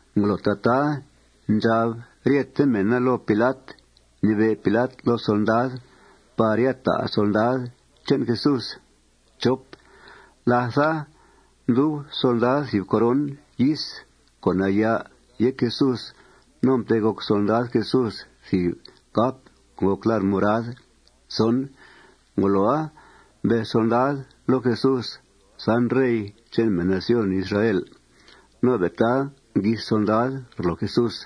Ngolo tataa ndxab ryete mèna loo Pilat, mnibe' Pilat loo solndad par ya ta' solndad che'n Jesús. Látha, mdub solndad thìb coron yis co' nayà' yéc Jesús. No mtegoc solndad Jesús thìb cap co' ngòc lar' morad. Ngoloa, mbez solndad loo Jesús: ―San, Rey che'n mèn nación Israel. No be' taa nguis solndad rloo Jesús.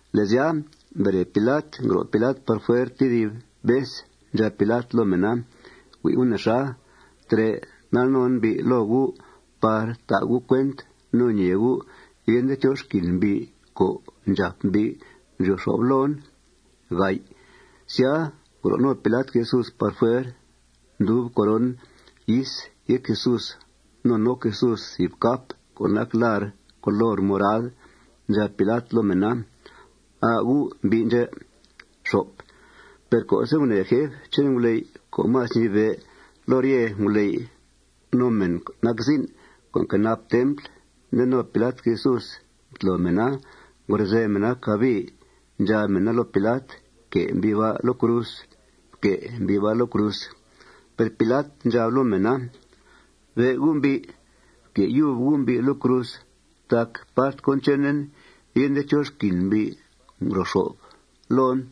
Le' sya, mbere Pilat. Ngro' Pilat par fuer tedib vez. Ndxab Pilat loo mèna: ―Hui' gu' nexa. Trè' ndal non mbi' loo gu' par ta' gu' cuent no ñee gu' yende chó xquin mbi' co' ndxàp mbi' ndryo xo'f loon. Sya, ngro' no Pilat Jesús par fuer. Ndub coron yis yéc Jesús. No noc Jesús thìb cap co' nac lar' color morad. Ndxab Pilat loo mèna: ―Aa gu' mbi' ndxè'. Per co'se' gunèe jef che'n nguley' co' más ñibe' loo rye nguley' no mèn nac zin' co' nquenap templ nde no Pilat Jesús, mtlo mèna, ngrozèe mèna cabii. Ndxab mèna loo Pilat: ―Fque' mbi' ba' loo cruz. Fque' mbi' ba' loo cruz. Per Pilat ndxab loo mèna: ―Be' gu' mbi'. Fque' yub gu' mbi' loo cruz tac part cón chenen yende chó xquin mbi' ngro xo'f loon.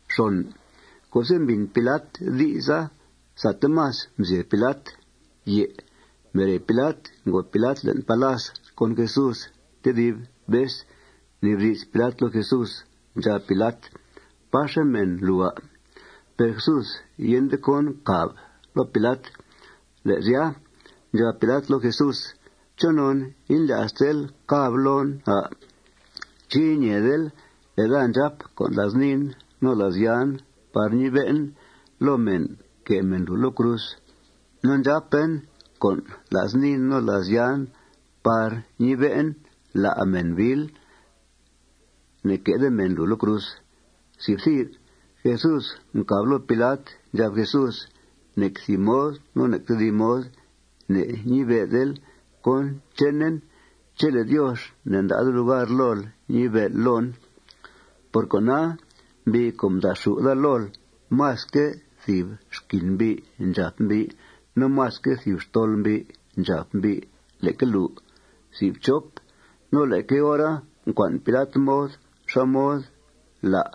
Per co'se' mbìn Pilat di'sa, sate más mzyeb Pilat. Mbere Pilat, ngòo Pilat le'n palas con Jesús tedib vez. Mnibdi's Pilat loo Jesús. Ndxab Pilat: ―¿Páxe' mèn lùu, à'? Per Jesús yende cón mcàb loo Pilat. Le' sya, ndxab Pilat loo Jesús: ―¿Chonon indlya'stel càbl loon, à'? ¿Ché' iñeedel le' daa ndxàp con' la's niin no la's yan par ñibe'en loo mèn que' mèn lùu loo cruz? No ndxàpen con' la's niin no la's yan par ñibe'en la' mèn biil. Ne'que'de mèn lùu loo cruz. Jesús mcàb loo Pilat. Ndxab Jesús: ―Nec thìb mod no nec tedib mod ne'ñibe'del cón chenen chele' Diox ne'nda'de lugar lool ñibe'l loon. Por cona, mbi' co' mda'xù' daa lool másque' thìb xquin mbi' ndxàp mbi' no másque' thìb xtol mbi' ndxàp mbi' leque lùu. No leque hora mcua'n Pilat mod xá mod la'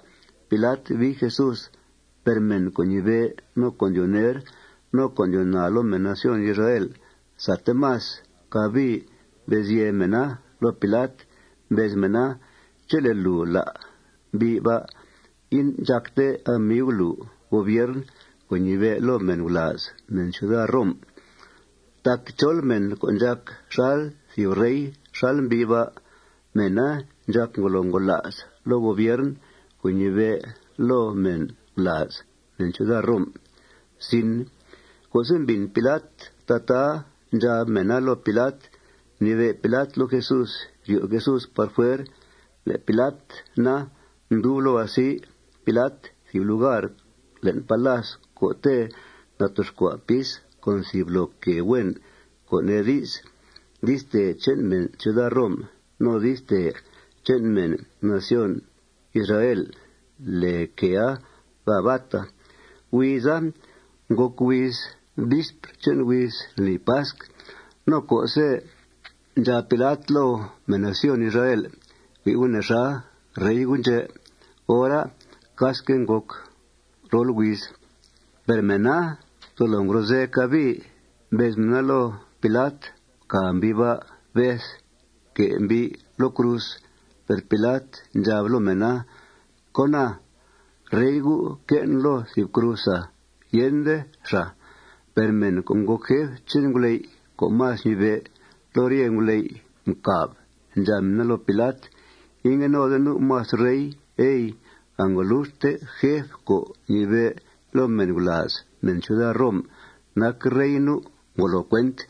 Pilat bii Jesús. Per mèn co' ñibe', no co' ndyoo ner, no co' ndyoo naa loo mèn nación Israel, sate más cabii mbez yèe mèna loo Pilat. Mbez mèna: ―Chele' lùu lá' mbi' ba', indxàcte amiu lùu gobiern co' ñibe' loo mèn gulàaz mèn ciuda Rom. Tac chol mèn co' ndxàc xal thìb rey xal mbi' ba', mèna ndxàc ngolo ngola's loo gobiern co' ñibe' loo mèn gulàaz mèn ciuda Rom. Co'se' mbìn Pilat tataa ndxab mèna loo Pilat, mnibe' Pilat loo Jesús ryo' Jesús par fuer. Le' Pilat na, mdub loo asi Pilat thìb lugar le'n palas co'te' natoxcua' pis con thìb loo quèe huen, co' nee di's, di'stèe che'n mèn ciuda Rom. No di'stèe che'n mèn nación Israel lèe quèea Gabata. Huiza ngòc huiz vispr che'n huiz lni pasc. No co'se' ndxab Pilat loo mèn nación Israel: ―Hui' gu' nexa, Rey gu' ndxè', hora casque' ngòc rol huiz. Per mèna tolo ngrozèe. Cabii mbez mèna loo Pilat: ―Fcàa mbi' ba'. Beth. Fque' mbi' loo cruz. Per Pilat ndxab loo mèna: ―¡Cóna! ¿Rey gu' que'en loo thìb cruz, à'? Yende xàa. Per mèn co' ngòc jef che'n nguley' co' más ñibe' loo rye nguley' mcàb. Ndxab mèna loo Pilat: ―Ingue node nu' más rey, ey. Angoluxte jef co' ñibe' loo mèn gulàaz mèn ciuda Rom nac rey nu'. Ngolo cuent.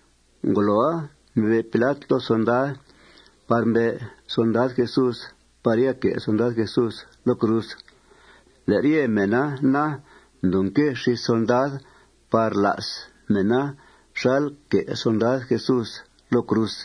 Ngoloa, mnibe' Pilat loo solndad par mbe' solndad Jesús par ya que' solndad Jesús loo cruz. Le' rye mèna na, mdoo nque xís solndad par la's mèna xal que' solndad Jesús loo cruz.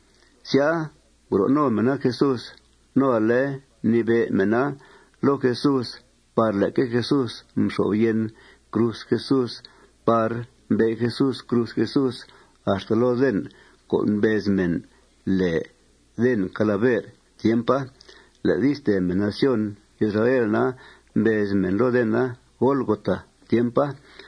Sya, ngro' no mèna Jesús. No ale mnibe' mèna loo Jesús par leque Jesús mxo'f yen cruz Jesús par mbe' Jesús cruz Jesús axta loo den co' mbez mèn lèe Den Calaver tiempa. Le' di'stèe mèn nación Israel na, mbez mèn loo dena Golgot tiempa.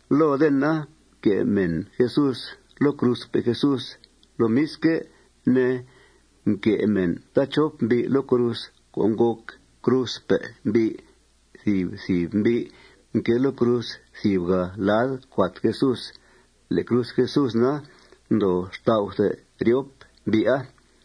Loo dena mque' mèn Jesús loo cruzpe' Jesús. Lomisque' ne, mque' mèn taachop mbi' loo cruz co' ngòc cruzpe' mbi', thìb thìb mbi' mquée loo cruz thìbgà' lad cuat Jesús. Le' cruz Jesús na, mdoo xtau' ryop mbi'a.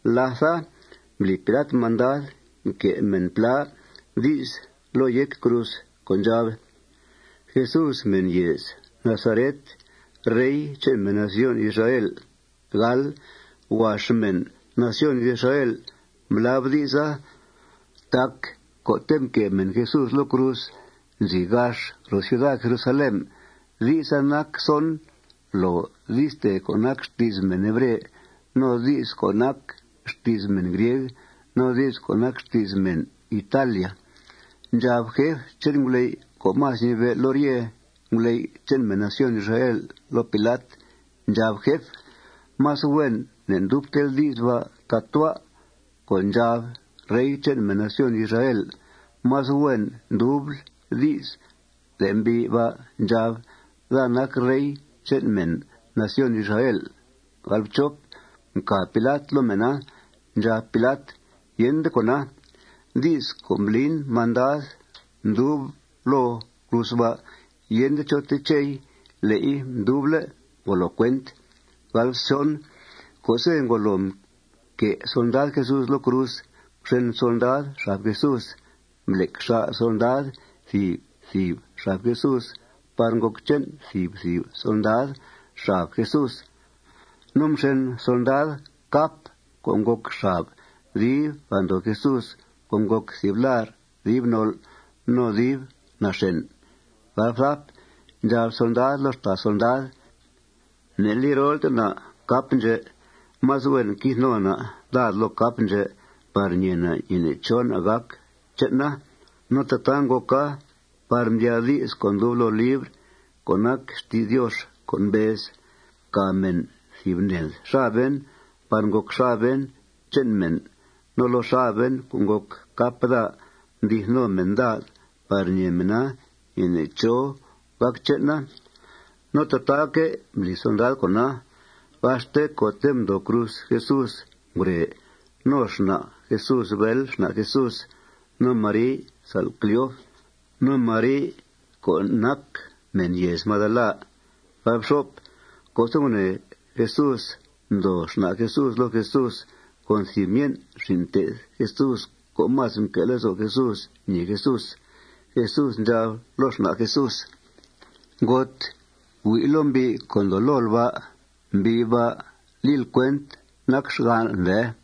Látha, mbli Pilat mandad mque' mèn plá di's loo yéc cruz co' ndxab: Jesús, mèn yèez Nazaret, rey che'n mèn nación Israel. Huax mèn nación Israel mblab di'sa tac co'te' mque' mèn Jesús loo cruz nzi gax ro ciuda Jerusalén. Di'sa nac son loo di'stèe co' nac xti's mèn hebre, no di's co' nac xti's mèn grieg, no di's co' nac xti's mèn italia. Ndxab jef che'n nguley' co' más ñibe' loo rye nguley' che'n mèn nación Israel loo Pilat. Ndxab jef: ―Más huen ne'ndubtel di's ba' tatua' co' ndxab: Rey che'n mèn nación Israel. Más huen ndubl di's le' mbi' ba' ndxab: Daa nac rey che'n mèn nación Israel. Mcàb Pilat loo mèna. Ndxab Pilat: ―Yende cóna. Di's co' mblin mandad mdub loo cruz ba', yende chó techei. Le'i nduble'. Ngolo cuent. Co'se' ngolo mque' solndad Jesús loo cruz, mxen solndad xab Jesús. Mblec xà' solndad thìb thìb xab Jesús par ngòc che'n thìb thìb solndad xab Jesús. No mxen solndad cap co' ngòc xab dib andoo Jesús co' ngòc thìb lar' dib nol' no dib naxèn. Ndxab solndada loo xtàa solndad: ―Ne'li rolte na' cap ndxè'. Más huen quith no na' dad loo cap ndxè' par ñee na' ñeene' chó na' gàc che'na. No tataa ngòca par mdyaa di's co' ndub loo libr co' nac xti's Diox co' mbez: Mcàa mèn thìb ned xaben par ngòc xaben che'n mèn. No loo xaben co' ngòc cap daa mdi'th no mèn dad par ñee mèna ñeene' chó gàc che'na. No tataaque' mbli solndad con'a. Gaxte co'te' ndoo cruz Jesús ngure no xna' Jesús bél xna' Jesús, no Mari sa'l Cleof, no Mari co' nac mèn yèez Magdala. Co'se' gunèe Jesús ndoo xna' Jesús loo Jesús con thìb myen' xin' mté'th Jesús co' más mque' lezo' Jesús ñèe Jesús, Jesús ndxab loo xna' Jesús: ―Ngot, hui' loo mbi' co' ndoo lool ba'. Mbi' ba' lil cuent nac xgan'l, ndee.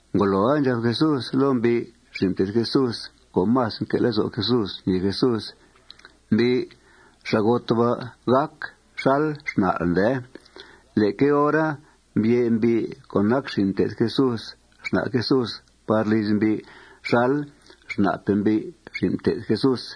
Ngoloa, ndxab Jesús loo mbi' xin' mté'th Jesús co' más mque' lezo' Jesús ñèe Jesús: ―Mbi', xa'got ba' gàc xal xna'l, ndee. Leque hora, mbye' mbi' co' nac xin' mté'th Jesús xna' Jesús par liz mbi' xal xna'pe' mbi' xin' mté'th Jesús.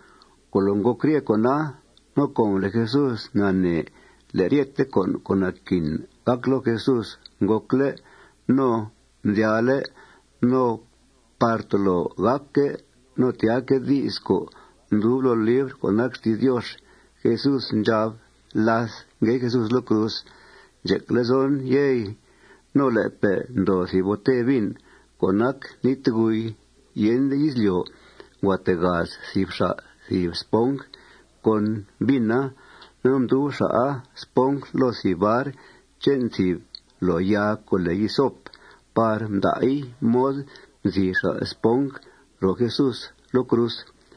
Ngolo ngòc rye con'a, no com le' Jesús nanee le' ryete con' co' naquin gàc loo Jesús ngòcle' no mdyaale' no par tolo gàcque' no tyaaque' di's co' ndub loo libr co' nac xti's Diox, Jesús ndxab láth ngue Jesús loo cruz: ―Ndxec lezon, yey. No le'pe' ndoo thìb bote vin co' nac nítguy. Yende izlyo', ngua tegaz thìb xa' thìb sponj con vina. No mdub xa'a sponja loo thìb bar che'n thìb loo yaa co' lèe hisop par mda'i mod mzii xa' sponja ro Jesús loo cruz.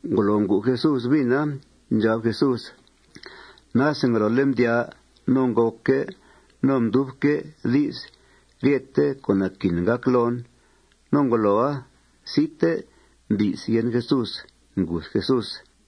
Ngolo ngu Jesús vina, ndxab Jesús: ―Nase ngolole' mdyaa no ngòcque' no mdubque' di's ryethe con' naquin gàc loon. No ngoloa, site mbi's yen Jesús. Nguth Jesús.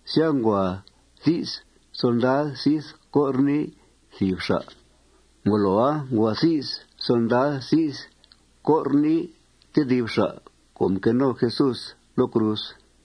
Sya, ngua thi's solndad zith cor nii thìb xa'. Ngoloa, ngua thi's solndad zith cor nii tedib xa' co' mquée no Jesús loo cruz.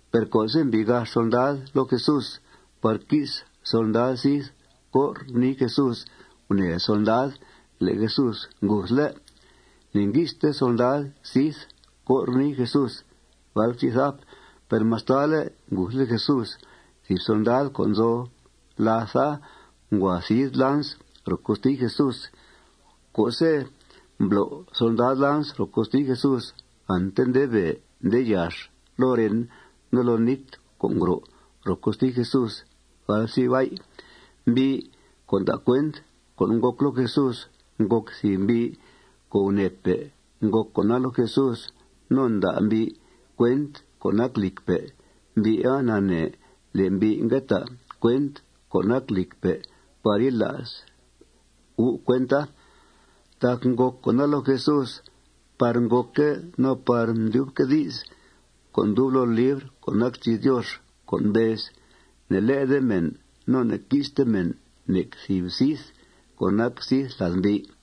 Per co'se' mbii gax solndad loo Jesús par qui's solndad zith cor nii Jesús, gunèe solndad le' Jesús nguthle'. Ne'ngui'ste solndad zith cor nii Jesús. Per mastale' nguthle' Jesús, thìb solndad co' nzo làtha ngua thid lans ro costi Jesús. Co'se' mblo' solndad lans ro costi Jesús, ante nde bèe nde yax loo ren no loo nít co' ngro' ro costi Jesús. Mbi' co' nda' cuent con' ngòc loo Jesús ngòc thìb mbi' co' gunèepe' ngòc con'a loo Jesús. No nda' mbi' cuent co' nac lìcpe'. Mbi'a nanee le' mbi' ngue ta' cuent co' nac lìcpe' par yila's gu' cuenta. Tac ngòc con'a loo Jesús par ngòcque' no par mdyubque' di's co' ndub loo libr co' nac xti's Diox co' mbez: Ne'lé'de mèn no ne'qui'ste mèn nec thìb zith co' nac zith lad mbi'.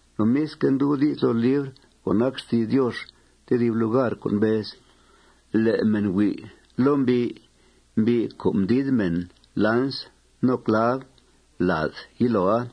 Lomisque', ndub di's loo libr co' nac xti's Diox tedib lugar co' mbez: Le' mèn hui' loo mbi', mbi' co' mdid mèn lans no clav lad yiloa.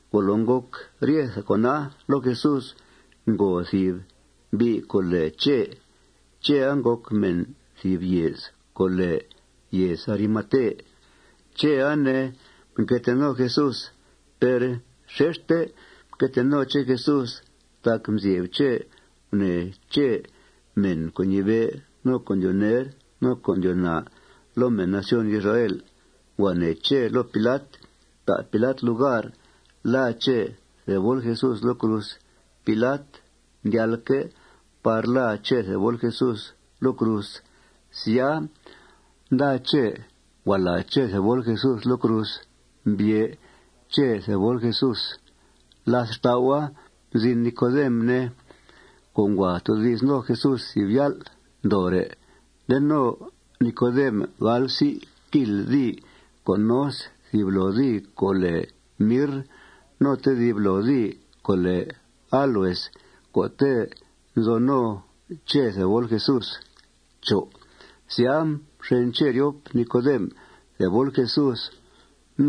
Ngolo ngòc ryethe con'a loo Jesús, ngo thìb mbi' co' lèe Chè. Chèa ngòc mèn thìb yèez co' lèe yèez Arimate. Chèa, ne, mque tee no Jesús. Per xexte mque tee no Chè Jesús tac mzyeb Chè gunèe Chè mèn co' ñibe', no co' ndyoo ner, no co' ndyoo naa loo mèn nación Israel. Ngua nee Chè loo Pilat ta' Pilat lugar làa Chè thebol Jesús loo cruz. Pilat mdyalque' par làa Chè thebol Jesús loo cruz. Sya, nda Chè. Ngua làa Chè thebol Jesús loo cruz. Mbye' Chè thebol Jesús. Làth xtau'a, mzin Nicodem, ne, co' ngua toodi's no Jesús thìb yál' ndoore'. Nde no Nicodem gal psi' kil dii co' nos thìb loo dii co' lèe mirr no tedib loo dii co' lèe áloes co'te' nzo no Chè thebol Jesús. Sya, mxen Chè ryop Nicodem thebol Jesús.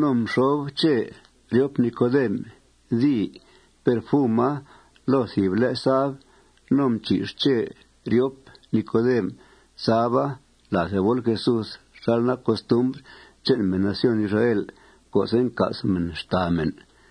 No mxob Chè ryop Nicodem dii perfuma loo thìb le' sab. No mchì'x Chè ryop Nicodem saba lad thebol Jesús xal nac costumbr che'n mèn nación Israel co'se' nca's mèna xtàa mèn.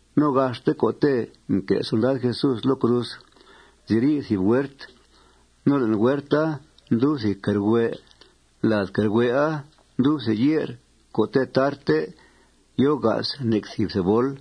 No gaxte co'te' mque' solndad Jesús loo cruz nziri' thìb huert. No le'n huerta ndub thìb quèe rhue'. Lad quèe rhue'a ndub thìb ye'r co'te' tarte yòo ga's nec thìb thebol.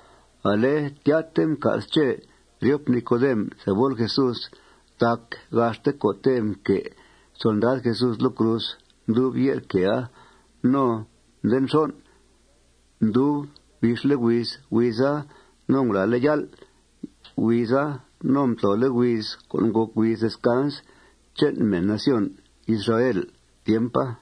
Ale tyate mca's Chè ryop Nicodem thebol Jesús tac gaxte co'te' mque' solndad Jesús loo cruz mdub ye'r quèea. No nde nxon', mdub bixle' huiz huiza no ngulàale' yál' huiza no mtlole' huiz co' ngòc huiz descans che'n mèn nación Israel tiempa.